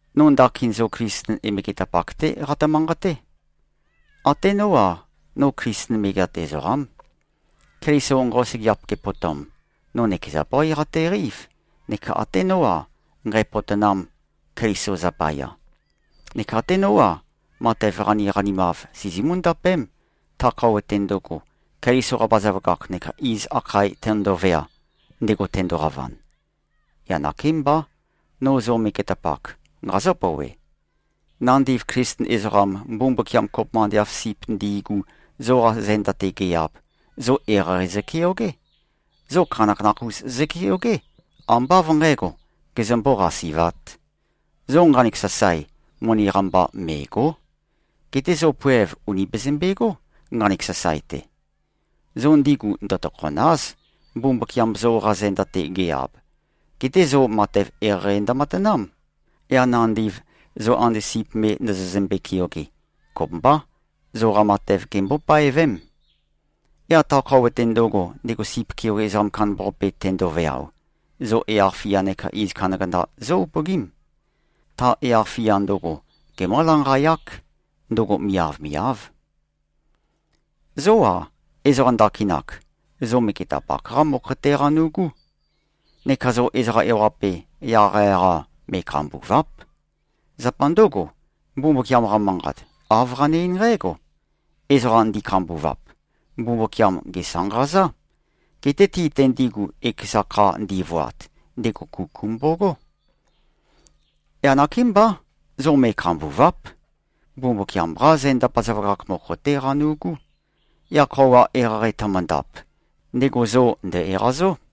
No ndakin zo Klisten megetapak-té qatø-manqaté. Até nó-a, no Klisten megeat ezoqám. Keliso nqosøgeap gepotom, no nøkeza bøí qateqeív, neka até nó-a, nqǣpōtōnām, Keliso zapaya. Neka até nó-a, matev qaniqanimav sizimú-ndapém, ta khøuwa-te ndøgo, Keliso-qa bazaføgakh neka iz akhae tøndovea, ndego tendoqavan. Yaq nakémbá, no zo megetapak, nqazǿ-pouwe: Nandiv Klisten ezoqam, Mbumbukiam kopømba ande av sip ndi꞉gu, zoqa zenda-te ge-ab, zo eqeieqei zøkeogé. Zo khanakhanakh-us zøkeogé, ambá av nqǣgo, gezømbó-qasi꞉vāt. Zo nqanek sasae, moni-qa mba mè꞉go᷄. Geté zo poev ùni bezømbegó, nqanek sasae-te. Zo ndigu ndøtokhòna᷄z, Mbumbukiam zoqa zenda-te ge-ab. Geté zo matev eqeieqei ndømatanám. Yaq nandiv, zo ande sip me ndozozømbe-keoge, kopømbá, zoqa matev gembó-paevém. Yaq ta khøuwa-te ndøgo, ndego sip keoge ezoqam kandambaqape tendoveao, zo yaq-fia neka iz kandakanda zó-upøgím. Ta yaq-fia ndøgo, gemǿ-lanqayák. Ndøgo miavmiáv. Zó-a, ezoqa ndakinak, zo megetapak-qá mokho-té qanu꞉gú. Neka zo ezoqa ewaqape, yaqyaq-a me꞉khambùva᷄p. Zapa ndǿgo, Mbumbukiam-qa Manqat, āv qane-eín nqǽgo, “Ezoqa ndi꞉khambuvap, Mbumbukiam gèsanqazá. Geté ti-te ndigu, ekeza kha ndivoat, ndego kuku mbogó.” Yaq nakémbá. Zo me꞉khambùva᷄p. Mbumbukiam-qá zenda bazaføgakh mokho-té qanu꞉gú. Yaq khøuwa eqeieqei tømøndap, ndego zo ndø̀-eqazó.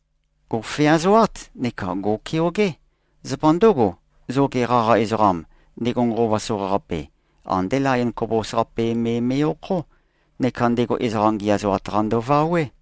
Gò꞉feazoát, neka gò꞉keogé. Zapa ndǿgo, zoge qaqa ezoqam, ndego nqova soqaqape, andé layon khobos-qape me me꞉-okhó, neka ndego ezoqa ngiæzoat-qa ndøvawé.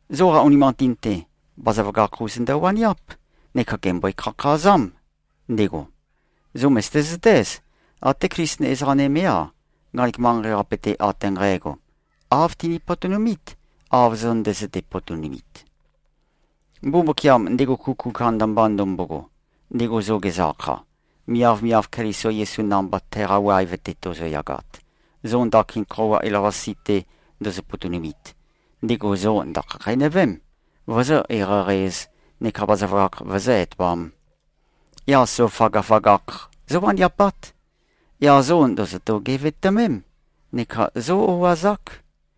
Zoqa unimanqatin-te, bazaføgakh-us ndøwaniáp, neka gèmbøe-khakhazám, ndego. Zo mø̀zøte-zøtéz, até Klisten ezoqa nømé-a, nqanek manqei-qape-te ate nqægo, āv tini-potonumít, av zo ndøzøte-potonumit. Mbumbukiam, ndego kuku kandamba ndømbogo, ndego zo gezø-akha, miavmiav Keliso Yesu namba teqa waev-te tozoyagat, zo ndakin khøuwa elavøqasi-te ndozo-potonumit, ndego zo ndø̀khakheinøvém, vozó-eqeieqei-ēz, neka bazaføgakh vøzǿ-etoām. Yaq zo føgøføgakh zówaniapát. Yaq zo ndòzoto-gevetømém, neka zó-o꞉azák.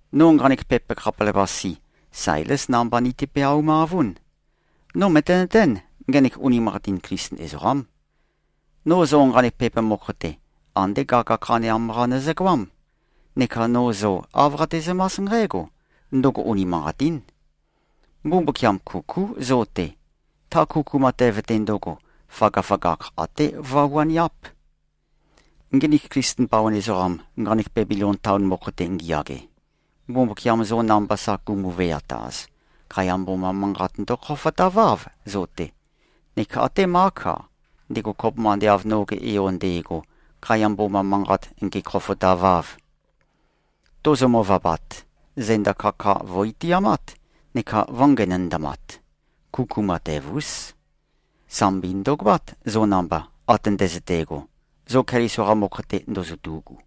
No nqanek pepa khapelavøqase, Sailés namba niti-peaumavún. No mø̀tenøtén, ngenek unimanqatin Klisten ezoqám. No zo nqanek pepa mokho-te, andé gaga khaneam-qa nøzøgoám. Neka no zo āv qatezømás nqǽgo: Ndøgo unimanqatín. Mbumbukiam kukú zo-te. Ta kuku matev-te ndøgo, føgøføgakh até vøwaniáp. Nginik Klisten bawan ezoqam, nqanek Bebilon taon mokho-te ngiyage, Mbumbukiam zo namba sa gumu-veataz, khaiya mboma manqat ndøkhofotaváv, zo-te. Neka até Mák-a, ndego kopømba ande av noge yo nde꞉go, khaiya mboma manqat ngēkhōfōtāvāv. Tozo-møvabat, zenda kaka vø̀-itiamát neka vø̄ngenøndamat. Kuku matev-ús. Sambi ndø̀goát, zo namba, ate ndøzøte꞉go, zo Keliso-qa mokho-te ndozotu꞉gu.